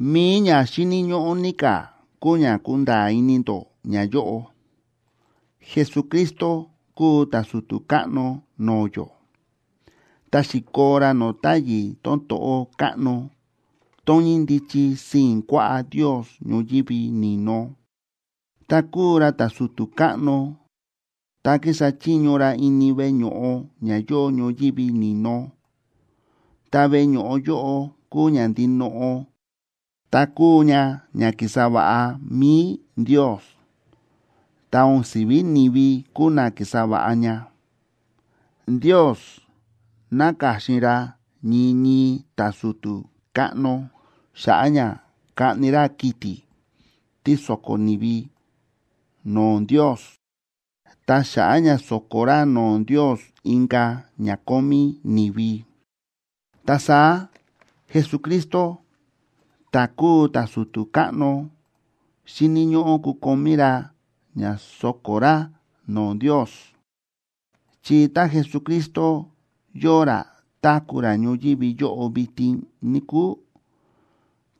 Mi̱i ña xíni̱ ñóꞌó ní ka̱ kúu ña kunda̱a̱ ini ndó ñayóꞌo: Jesucristo kúu ta̱su̱tu̱ káꞌno no̱o̱ yó, ta xi̱koo ra no̱o̱ táyi̱ tón to̱ꞌó káꞌno tón ñíndichi sii̱n kuaꞌá Ndios ñoyívi ni̱no. Ta kúu ra ta̱su̱tu̱ káꞌno ta kísa chiño ra ini veꞌe ño̱ꞌo ña yóo ñoyívi ni̱no, ta veꞌe ño̱ꞌo yóꞌo kúu ña ndinoꞌo ta kúu ña ña ki̱sa va̱ꞌa mi̱i Ndios, ta o̱n si̱ví ni̱vi kúu na ki̱sa va̱ꞌa ña. Ndios náka̱xin ra ñii ñii ta̱su̱tu̱ káꞌno xa̱ꞌa̱ ña kaꞌni ra kiti̱ tí so̱ko̱ ni̱vi no̱o̱ Ndios ta xa̱ꞌa̱ ña so̱ko̱ ra no̱o̱ Ndios inka̱ ña kómí ni̱vi. Ta saá Jesucristo ta̱ kúu ta̱su̱tu̱ káꞌno xíni̱ ñóꞌó kukomí ra ña so̱ko̱ ra no̱o̱ Ndios. Chi tá Jesucristo yóo ra táku̱ ra ñoyívi yóꞌo vitin, níkúu,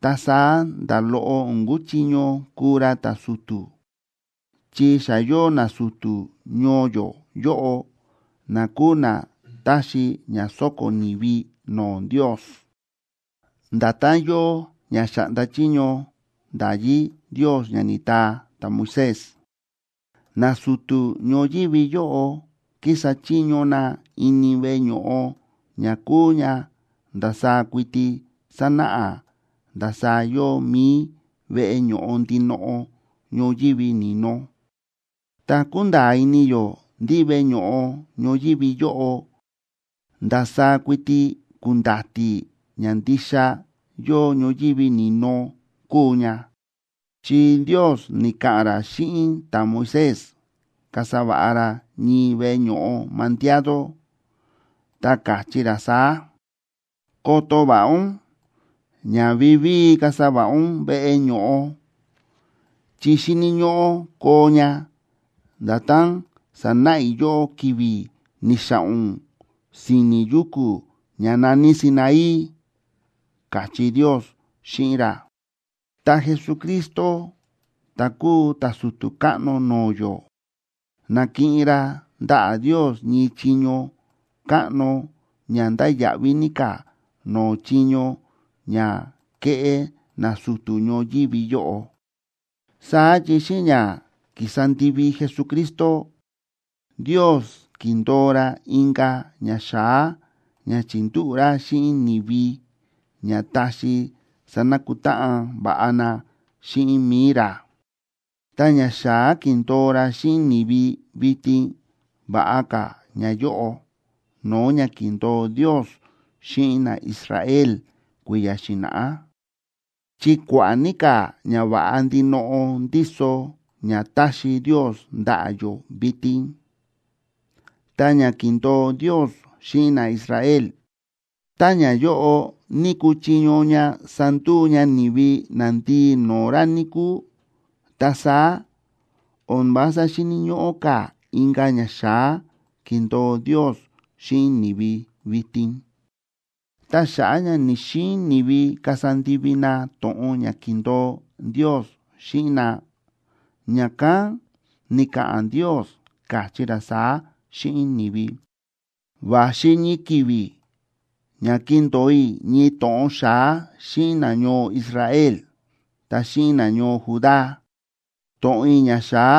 ta saá nda̱ loꞌo o̱n kuchiño kuu ra ta̱su̱tu̱, chi xa yóo nasu̱tu̱ ñoo yó yóꞌo na kúu na táxi ña sóko̱ ni̱vi no̱o̱ Ndios, nda̱tán yóo ña xa̱ꞌnda chiño nda̱yí Ndios ña ni̱taa ta̱Moisés. Nasu̱tu̱ ñoyívi yóꞌo kísa chiño na ini veꞌe ño̱ꞌo ña kúu ña ndasaá kuiti sánáꞌa ndasaá yóo mi̱i veꞌe ño̱ꞌo ndinoꞌo ñoyívi ni̱no. Ta kúnda̱a̱ ini yó ndí veꞌe ño̱ꞌo ñoyívi yóꞌo ndasaá kuiti ku̱nda̱ti̱ ña ndixa yóo ñoyívi ni̱no kúu ña, chi Ndios ni̱ka̱ꞌa̱n ra xíꞌin ta̱Moisés kasa va̱ꞌa ra ñii veꞌe ño̱ꞌo mandiado, ta káchí ra saá: “Koto va̱ꞌa ún ña vivíi kasa va̱ꞌa ún veꞌe ño̱ꞌo, chi xíni̱ ñóꞌó koo ña nda̱tán sa̱náꞌa i̱ yóꞌó ki̱vi̱ ni̱xa̱ꞌa̱n ún si̱ni̱ yuku̱ ña na̱ní Sinaí”, káchí Ndios xíꞌin ra. Ta Jesucristo ta̱ kúu ta̱su̱tu̱ káꞌno no̱o̱ yó, na̱kiꞌin ra ndaꞌa̱ Ndios ñii chiño káꞌno ña ndáya̱ꞌví ní ka̱ no̱o̱ chiño ña kéꞌé nasu̱tu̱ ñoyívi yóꞌo. Saá chi xíꞌin ña ki̱sa ndivi Jesucristo, Ndios ki̱ndo̱o ra inka̱ ñaxa̱á ña chi̱ndúꞌu̱ ra xíꞌin ni̱vi ña taxi sanakutáꞌan va̱ꞌa na xíꞌin mi̱i ra. Ta ñaxa̱á ki̱ndo̱o ra xíꞌin ni̱vi vitin va̱ꞌa ka̱ ñayóꞌo no̱o̱ ña ki̱ndo̱o Ndios xíꞌin naIsrael kui̱ya̱ xi̱na̱ꞌá, chi kua̱ꞌa̱ ní ka̱ ñava̱ꞌa ndinoꞌo ndíso ña táxi Ndios ndaꞌa̱ yó vitin. Ta ña ki̱ndo̱o Ndios xíꞌin naIsrael, tá ñayóꞌo ní ku̱chiño ña sanduu ña ni̱vi nandii no̱o̱ ra, níkúu, ta saá o̱n vása xíni̱ ñóꞌó ka̱ inka̱ ñaxa̱á kindo̱o Ndios xíꞌin ni̱vi vitin. Ta xa̱ꞌa̱ ña ni̱‑xiin ni̱vi kasa ndivi na to̱ꞌon ña ki̱ndo̱o Ndios xíꞌin na, ña̱kán ni̱ka̱ꞌa̱n Ndios, káchí ra saá xíꞌin ni̱vi: Va̱xi ñii ki̱vi̱ ña kindo̱o i̱ ñii to̱ꞌon xa̱á xíꞌin nañoo Israel, ta xíꞌin nañoo Judá. To̱ꞌon i̱ ñaxa̱á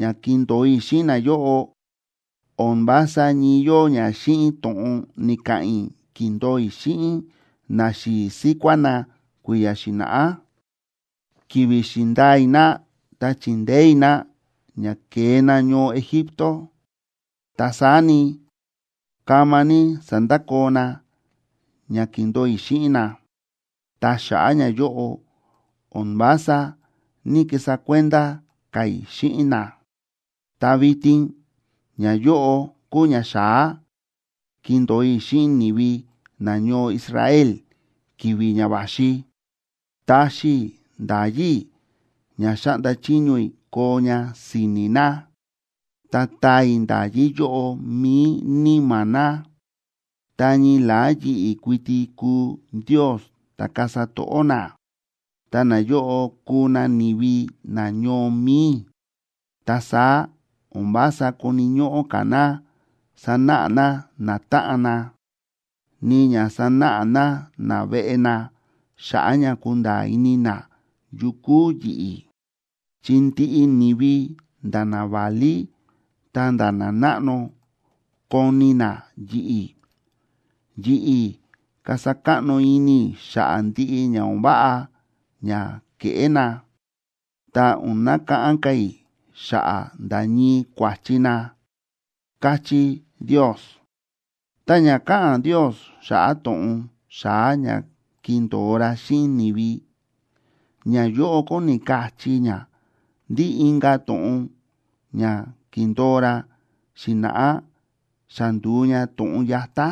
ña kindo̱o i̱ xíꞌin nayóꞌo o̱n vása ñii yóo ña xíꞌin to̱ꞌon ni̱ka̱ꞌa̱n i̱ ki̱ndo̱o i̱ xíꞌin naxi̱i̱ síkuá na kui̱ya̱ xi̱na̱ꞌá, ki̱vi̱ xi̱ndaa i̱ na ta chi̱ndeé i̱ na ña ke̱e na ñoo Egipto. Ta saá ni, kama ní sa̱ndakoo na ña ki̱ndo̱o i̱ xíꞌin na, ta xa̱ꞌa̱ ñayóꞌo o̱n vása ní‑kisa kuenda ka̱ i̱ xíꞌin na. Ta vitin ñayóꞌo kúu ñaxa̱á kindo̱o i̱ xíꞌin ni̱vi nañoo Israel ki̱vi̱ ña va̱xi: Taxi i̱ nda̱yí i̱ ña xáꞌnda chiño i̱ koo ña si̱ni̱ na, ta taa i̱ nda̱yí yóꞌo mi̱i níma̱ na. Ta ñii la̱á yi̱ꞌi̱ kuiti kuu Ndios ta̱ kasa to̱ꞌó na, ta nayóꞌo kuu na ni̱vi nañoo mi̱i i̱. Ta saá o̱n vása koni̱ ñóꞌó ka̱ na sanáꞌa na natáꞌan na, ni ña sanáꞌa na naveꞌe na xa̱ꞌa̱ ña kunda̱a̱ ini na yu kúu yi̱ꞌi̱. Chi ndiꞌi ni̱vi, nda̱ naválí ta̱nda̱ nanáꞌno, koni̱ na yi̱ꞌi̱. Yi̱ꞌi̱ kasa káꞌno ini i̱ xa̱ꞌa̱ ndiꞌi ña o̱n váꞌa ña ke̱ꞌé na, ta o̱n nakáꞌán ka̱ i̱ xa̱ꞌa̱ nda̱ ñii kua̱chi na, káchí Ndios. Ta ña káꞌa̱n Ndios xa̱ꞌa̱ to̱ꞌon xa̱á ña kindo̱o ra xíꞌin ni̱vi, ñayóꞌo kóni kachí ña ndí inka̱ to̱ꞌon ña ki̱ndo̱o ra xi̱na̱ꞌá xa ndu̱u ña to̱ꞌon yatá.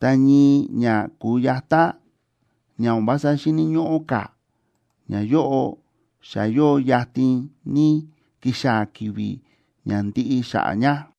Ta ñii ña ku̱yatá, ña o̱n vása xíni̱ ñóꞌó ka̱, ñayóꞌo xa yóo yatin ní kixaa̱ ki̱vi̱ ña ndiꞌi xa̱ꞌa̱ ña.